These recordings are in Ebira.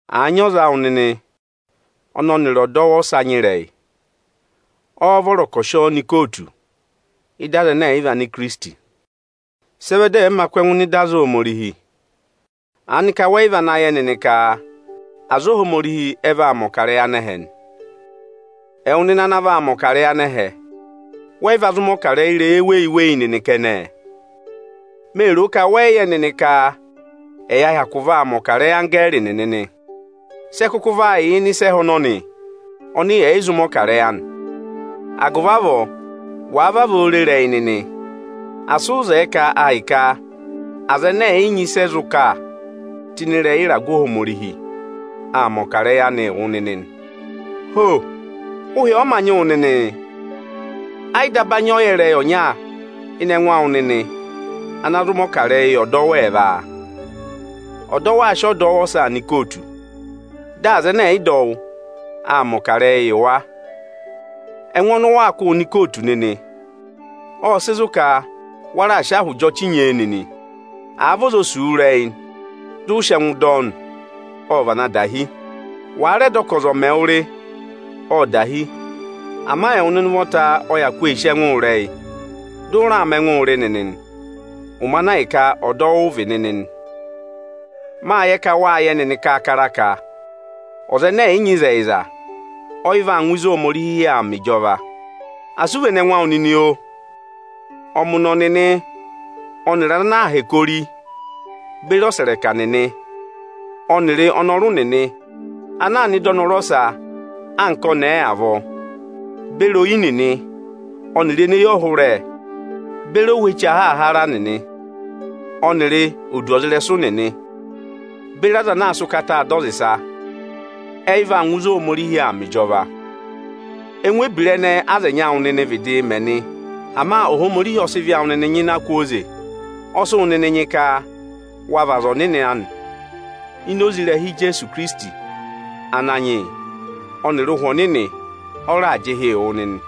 Àa nyị ọza awụ nịnị ọnị ọnịrị ọdọwụ ọsa nyị ịrẹyị, ọ́ọ́ vọrọ ka ọ̀ sị ọ nọ ikootu ịdị aza ẹnẹ ẹ̀ yị vị Anikirisiti? Sị ẹ vẹ dị ẹ̀ẹ ma kụ́ ẹngụ ẹnịnị nọ ịdị aza Ohomorihi? Aanị ka wẹ yị vana yẹ nịnị ka aza Ohomorihi ẹ vaa mẹ̀ ọkarẹyị anẹhẹ nị? Ẹwụ nịnị ana vaa mẹ̀ ọkarẹyị anẹhẹ, wẹ́ yị va zụ mẹ̀ ọkarẹyị ịrẹyị eweyi-eweyi nịnị kẹnẹẹ? Mee ro ka wẹ́ yị vana yẹ nịnị ka ẹyaa vaa mẹ̀ ọkarẹyị anggẹẹrị nịnị nị? Sị ẹ kụkụ va yà ịnị ịsa ẹhẹ ọnọnị ọnị yẹ̀ yị zụ mẹ̀ ọkarẹyị anị? Agụvị avọọ, wàa vavọọ re ịrẹyị nịnị, asị ụ zẹẹ ka ahịka aza ẹnẹ ẹ̀ yị nyị ịsị ẹ zụ kà tụ́ ịnị ịrẹyị ịragụ Ohomorihi, ọ̀ mẹ ọkarẹyị anị yị wụ nịnị nị. Ho! Ụhị ọ mā nyị wụ nịnịị? Ẹ yị daba nyị ọyẹrẹyị ọnya ịnị ẹngụ awụ nịnị ana zụ mẹ̀ ọkarẹyị yị ọdọwụ ẹẹva? Ọdọwụ aa sị ọdọwụ ọsaa nọ ikootu, dị aza ẹnẹ ẹ̀ yị dọ wụ aa mẹ̀ ọkarẹyị yị wa. Ẹngụ ọnị ụ waa kụ́ụ nọ ikootu nịnị, ọ́ọ sị zụ ka wa raà sị ahị jị ọchị nyee nịnị. Àa vị ọza o sì wu ịrẹyị dị ụ sị ẹngụ dọ ọ nị, ọ́ọ vana dahi. Wàa rẹ dọ ka ọza ọ̀ mẹ wụ rị, ọ́ọ dahi. Ama ẹwụ nịnị ụvọta ọ hyakụ ee sì ẹngụ ịrẹyị, dị ụ raa mẹ ẹngụụ rị nịnị ịnị ụmẹ ana ahịka ọdọwụ ụ vị nịnị nị. Máa yẹ ka wáa yẹ nịnị kaakara ka ọza ẹnẹ ẹ̀ yị nyị ịzẹyịza, ọ yị vaa ngụ ịzị Ohomorihi yà aa mẹ ịjọva. Asị ụ vene ẹngụ awụ nịnị oo! Ọmụnọ nịnị ọnịrị aza ana aa hẹkẹ ori, beri ọsẹrẹka nịnị ọnịrị ọnọrụ nịnị anaā nọ ịdị ọnọrụ ọsa anka ọnẹẹ avọọ, beri oyi nịnị ọnịrị eneyọhụrẹ beri ohweche ahaahara nịnị ọnịrị aza eneē du ọza ịrẹsụ beri aza anaā sịị ụkataa dọ ọza ịsa, ẹ yị vaa ngụ ịzị Ohomorihi yà aa mẹ ịjọva. Ẹngụ ebira ẹnẹẹ aza ẹnyị awụ nịnịị̄ vịdịị mẹ nị. Ama Ohomorihi ọ sị ịvị awụ nịnị nyịna kwooze, ọ sị wụ nịnị nyị ka wa vị aza ọnịnị anị. Ini oze ịrẹha Ijeesu Ikirisiti Ananyị yị ọnịrị Ụhwẹ Ọnịnị, ọ raà jị ịhị yị wụ nịnị.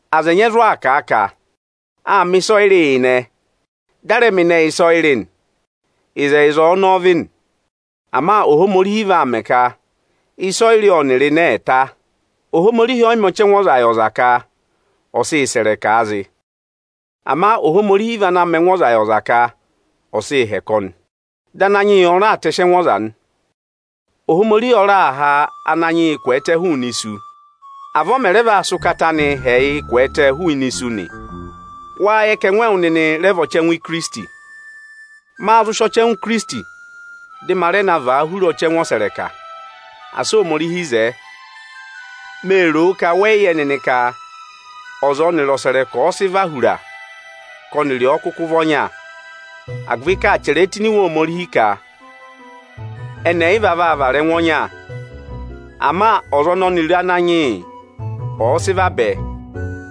Aza ẹnyị ẹ zụ aa kà a ka: Áa mẹ̀ ịsọyịrị yị izinẹ, dị a rẹ mẹ izinẹ yị ịsọyịrị nị. Ịzẹyịza ọnọọ vị nị Ama Ohomorihi vaa mẹ ka ịsọyịrị ọnịrị izinẹ ẹ̀ ta. Ohomorihi ọ yị mẹ ọchẹngụ ọza yị ọza ka ọ̀ sịị sẹ̀ ịrẹkaa zị. Ama Ohomorihi vị ana mẹ ẹngụ ọza yị ọza ka ọ sịị hẹkẹ ọnị, dị Ananyị yị ọnị raa tẹsị ẹngụ ọza nị. Ohomorihi ọ raà ha Ananyị yị kwẹẹtẹ hụụnị isu, avọọ ọ mẹ rẹ vaa sị ụkata anịị ha ẹyịị kwẹẹtẹ hụụnị isu nị. Wáá yẹ ka ẹngụ ẹwụ nịnị rẹ vị ọchẹngụ Ikirisiti? Máá zụ sị ọchẹngụ Ikirisiti dị ma rẹ na vàa hura ọchẹngụ ọsẹrẹka? Asị Ohomorihi zẹẹ! Mee ro ka wẹ yị yẹ nịnị ka ọza ọnị ọnịrị ọsẹrẹka ọ̀ọ sị và hura ka ọnịrị ọ kụkụ vị ọnya? Agụvị ka áa chẹrẹ tụ́ ini Iwe Ohomorihi ka: Ẹnị ẹyịva vaa vara ẹngụ ọnya. Ama ọza ọnị ọnịrị Ananyị yị ọ̀ọ sị vabẹ,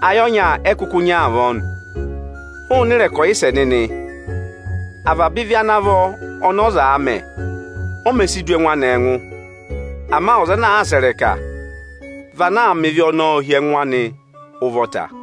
ayị ọnya ẹ kụkụ nyị avọọ nị. Hụụnị ịrẹkọyịsẹ nịnị! Avaba ịvị ana vọ ọnị ọzaā mẹ, o mē si du ẹngụ anị ẹngụ. Ama ọza ana sẹ̀ ịrẹka, vị ana mẹ ịvị ọnọọ hi ẹngụ anị ụvọta.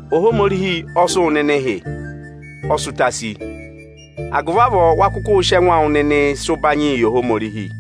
Ohomorihi ọ sị wụ nịnịị hị́, ọ sị ụta sí; agụvị avọọ wa kụkụụ sị ẹngụ awụ nịnịị sị ụbanyịị yị Ohomorihi.